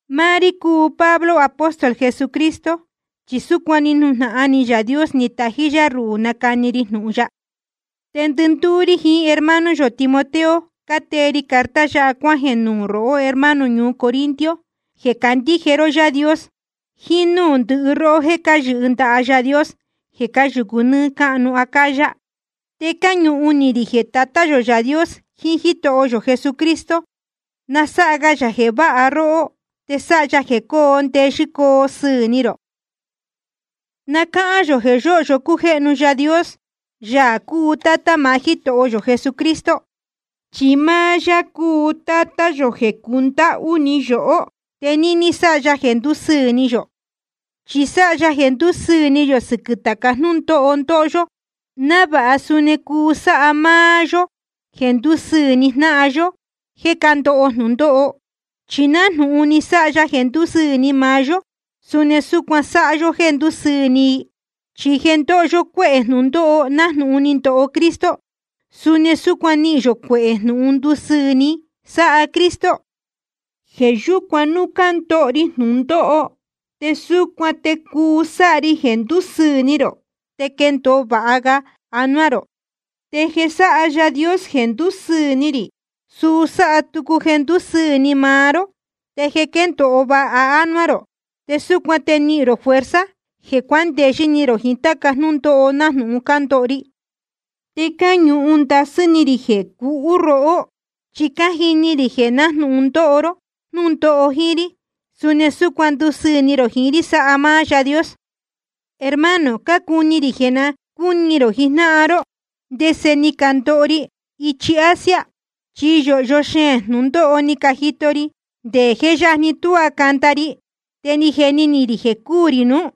Máá rí cúu Pablo, apóstol Jesucristo, chi súcuan ni nujnahan ni Yaā Dios ni tají yá ruhū nacani ri jnūhun ya. Te ndɨndúú rí jiín hermano yō Timoteo cátee ri carta yáha cuájeē nuū rohó hermano ñuu Corinto jeē cácandíje ró Yaā Dios, jiín núū ndɨhɨ róhó jéē cáyɨhɨ ndaha Yaā Dios jeē cáyūcu nɨ́ɨ́ cáhnu Acaya. Te cáñuhun ni rī jeē Tatá yō Yaā Dios jiín Jítoho yō Jesucristo na sáha ga yā jeē váha róhó te sáha ya jeē coo ndeyɨ́ coo sɨɨ̄ ni rō. Na cáhán yō jeē yóhyo cújéhnu Yaā Dios, Yaā cúu Tátá maá Jítoho yō Jesucristo. Chi máá yá cúu Tátá yō jeē cundáhú ni yohó, te níní sáha ya jeē ndúsɨɨ̄ ni yō. Chi sáha ya jeē ndúsɨɨ̄ ni yō sɨquɨ̄ tāca jnúndóho ndóho yó, návāha suni cuu sáha máá yó jeē ndúsɨɨ̄ ni jnáhan yó jéē cándoho jnūndóho. Chi nájnūhun ni sáha ya jeē ndúsɨɨ̄ ni maá yó, suni súcuan sáha yó jéē ndúsɨɨ̄ ni i. Chi jeē ndóho yó cuehē jnūndóho nájnūhun ni ndoho Cristo, suni súcuan nihīn yō cuehē jnūhun ndusɨɨ̄ ni, sáha Cristo. Jeē yúcuan núu cándoho ri jnūndóho te súcuan te cuu sáha ri jeē ndúsɨɨ̄ ni rō te quendōo vāha ga anuá rō. Te jeē sáha Yaā Dios jeē ndúsɨɨ̄ ni rī, suu sáha tucu jeē ndúsɨɨ̄ ni maá ró, te quéndōo vāha ga anuá rō. Te súcuan te nihīn rō fuerza jeē cuándeyɨ́ ni rō jiín táca jnúndóho nájnūhun cándoho ri. Te cáñuhun ndasɨ́ ni rī jeē cúu róhó, chi cájini rī jeē nájnūhun cándoho ró jnúndóho jíín rí, suni súcuan ndusɨɨ̄ ni rō jiín rí sáha máá Yaā Dios. Hermano, cácuni rī jeē na cúni rō jijnáhan ró ndese ni candoho ri ichi Asia. Chi yōhyo xeēn jnūndóho ni cajito ri, nde je yajni tuá canda ri, te ni jeni ni rī jeē cuu rī nuú.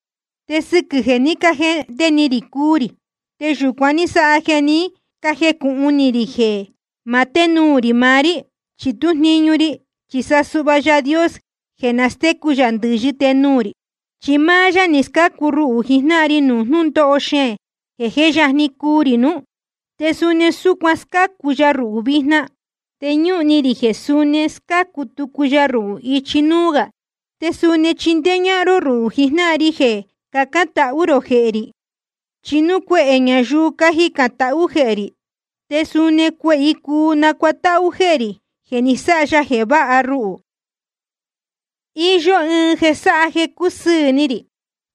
Te sɨquɨ̄ jeē ní cajehnde ni rī cuu rī, te yūcuan ní sáha jeē ní cajecūhun ni rī jeē ma ténuū rī maá rí chi tú jniñu ri, chi sa suhva Yaā Dios jeē nastécu ndɨ̄yɨ tenuū rī. Chi máá yá ni scácu ruhū jijnáhan ri nuū jnúndóho xeēn jeē jé yajni cuu rī nuú, te suni súcuan scácu ya ruhū vijna. Te ñúhun ni rī jeē suni scácu tucu ya ruhū ichi núú gā. Te suni na chíndéé ñáhán ró rúhū jijnáhan ri jeē cacān tahú rō jehē rī. Chi núu cuehē ñayuu cacān tahú jehē rī, te suni cuehē i cuu nacuatáhú jehē rī jeē ni sáha ya jeē váha ruhū. Iyó ɨɨn jeē sáha jeē cácusɨɨ̄ ni rī: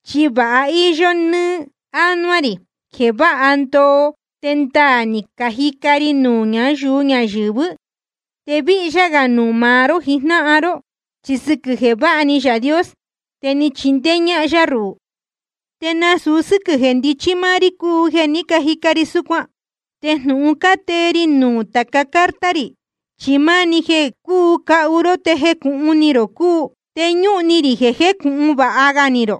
Chi vāha íyó ni anuá rī jeē váha ndoo te ndaā ni cajica ri nuū ñáyuu ñayɨ̄vɨ́, te víhyá gā nuū maá ró jijnáhan ró. Chi sɨquɨ̄ jeē váha ni Yaā Dios, te ni chindéé ñáhán yá ruhū, te nasūu sɨ́quɨ̄ jéē ndichí máá rí cúu jeē ní cajica ri súcuan. Te jnūhun cátee ri nuū tāca carta rī, chi máni jeē cúu cahu ró te jecūhun ni rō cúu. Te ñúhun ni rī jeē jecūhun vāha ga ni rō,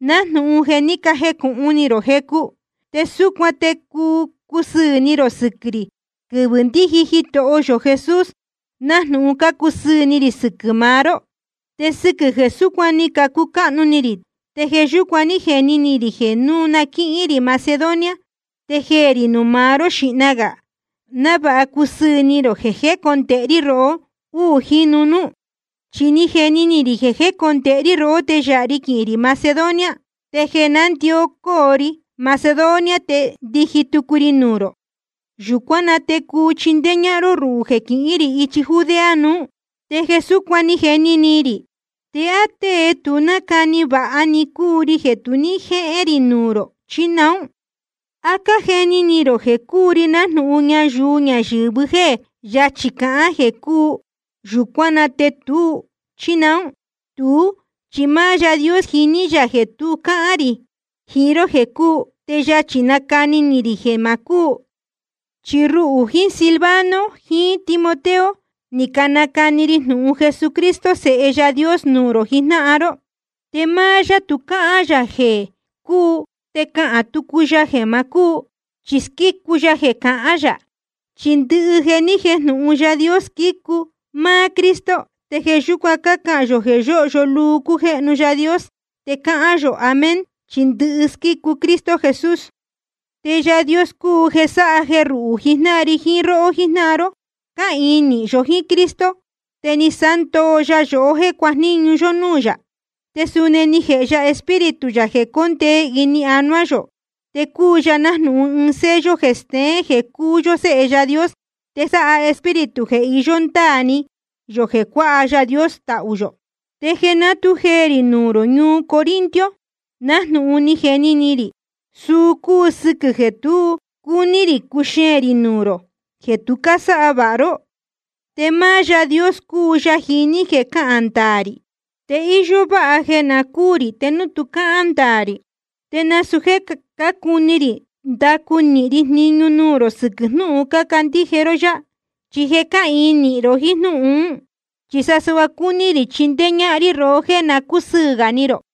nájnūhun je cájecūhun ni rō jecu. Te súcuan te cuu cusɨɨ̄ ni rō sɨquɨ̄ rī quɨvɨ̄ ndíji Jitoho yō Jesús, nájnūhun cácusɨɨ̄ ni rī sɨquɨ̄ maá ró. Te sɨquɨ̄ jeē súcuan ni cucáhnu ni rī, te jeē yúcuan ní jeni ni rī jeē núu na quíhín rī Macedonia te jeē rī nuū maá ró xīhna gā, návāha cusɨɨ̄ ni rō jeē jécondēhe rí rohó úū jínu núú. Chi ni jeni ni rī jeē jécondēhe rí rohó, te yāha ri quihīn rī Macedonia, te jeē nándicó rí Macedonia te ndiji tucu ri nuū rō. Yūcuán na te cuu chindéé ñáhán ró ruhū jeē quihín rī ichi Judea nuú. Te jeē súcuan ni jeni ni rī, ¿te á tée tu nácani vāha ni cúu ri jeē tu ní jéé rī nuū rō, chí naún? ¿A cájeni ni rō jeē cúu ri nájnūhun ñayuu ñayɨ̄vɨ jéē yachī cahán jeē cuu, yūcuán na te tuú, chí naún? Tuú chi máá Yaā Dios jíní yā jeē tu cáhán rī jiín ró jeē cuu, te yachī nácahān rī jeē ma cúu. Chi ruhū jiín Silvano jiín Timoteo ni canacani ri jnūhun Jesucristo Sēhe Yaā Dios nuū rō jijnáhan ró. Te máá yá tu cáhán yā jeē cuu te nacahān tucu ya jeē ma cúu. Chi squícu ya jeē cahán yā. Chi ndɨhɨ jeē ni jéjnūhun Yaā Dios, squícu máá Cristo. Te jeē yúcuan cácahān yō jeē yóhyo luu cújéhnu Yaā Dios, te cácahān yō Amén, chi ndɨhɨ squícu Cristo Jesús. Te Yaā Dios cúu jeē sáha jeē ruhū jijnáhan ri jiín róhó jíjnáhan ró, cáhīin nīhin yó jíín Cristo, te ni sándoo ya yohó jéē cuajníñu yó núū yā. Te suni ni jēhe ya Espíritu yā jeē cóndee ini anuá yō, te cúu ya nájnūhun ɨɨn sello jeē steén jeē cúu yó séhe Yaā Dios. Te sáha Espíritu jeē iyó ndáā ni yō jeē cuāha Yaā Dios tahū yō. Te jeē ná tu jeē rī nuū rō ñuu Corinto, nájnūhun ni jeni ni rī, suu cúu sɨquɨ̄ jeē tu ní cúní rī cuxeēn rī nuū rō jeē tu cásáha vāha ró. Te máá Yaā Dios cúu Yaā jiní jeē cahán ndaā rī. Te íyó váha jeē na cúū rī te núu tu cáhán ndaā rī. Te nasūu jéē cácuni rī ndacu nīhin ri jniñu nuū rō sɨquɨ̄ jnúhun cácandíje ró yá, chi je cáhīin nīhin ro jíín jnúhun ún. Chi sa suhva cácuni rī chindéé ñáhán rí rohó jéē na cúsɨɨ̄ gā ni rō.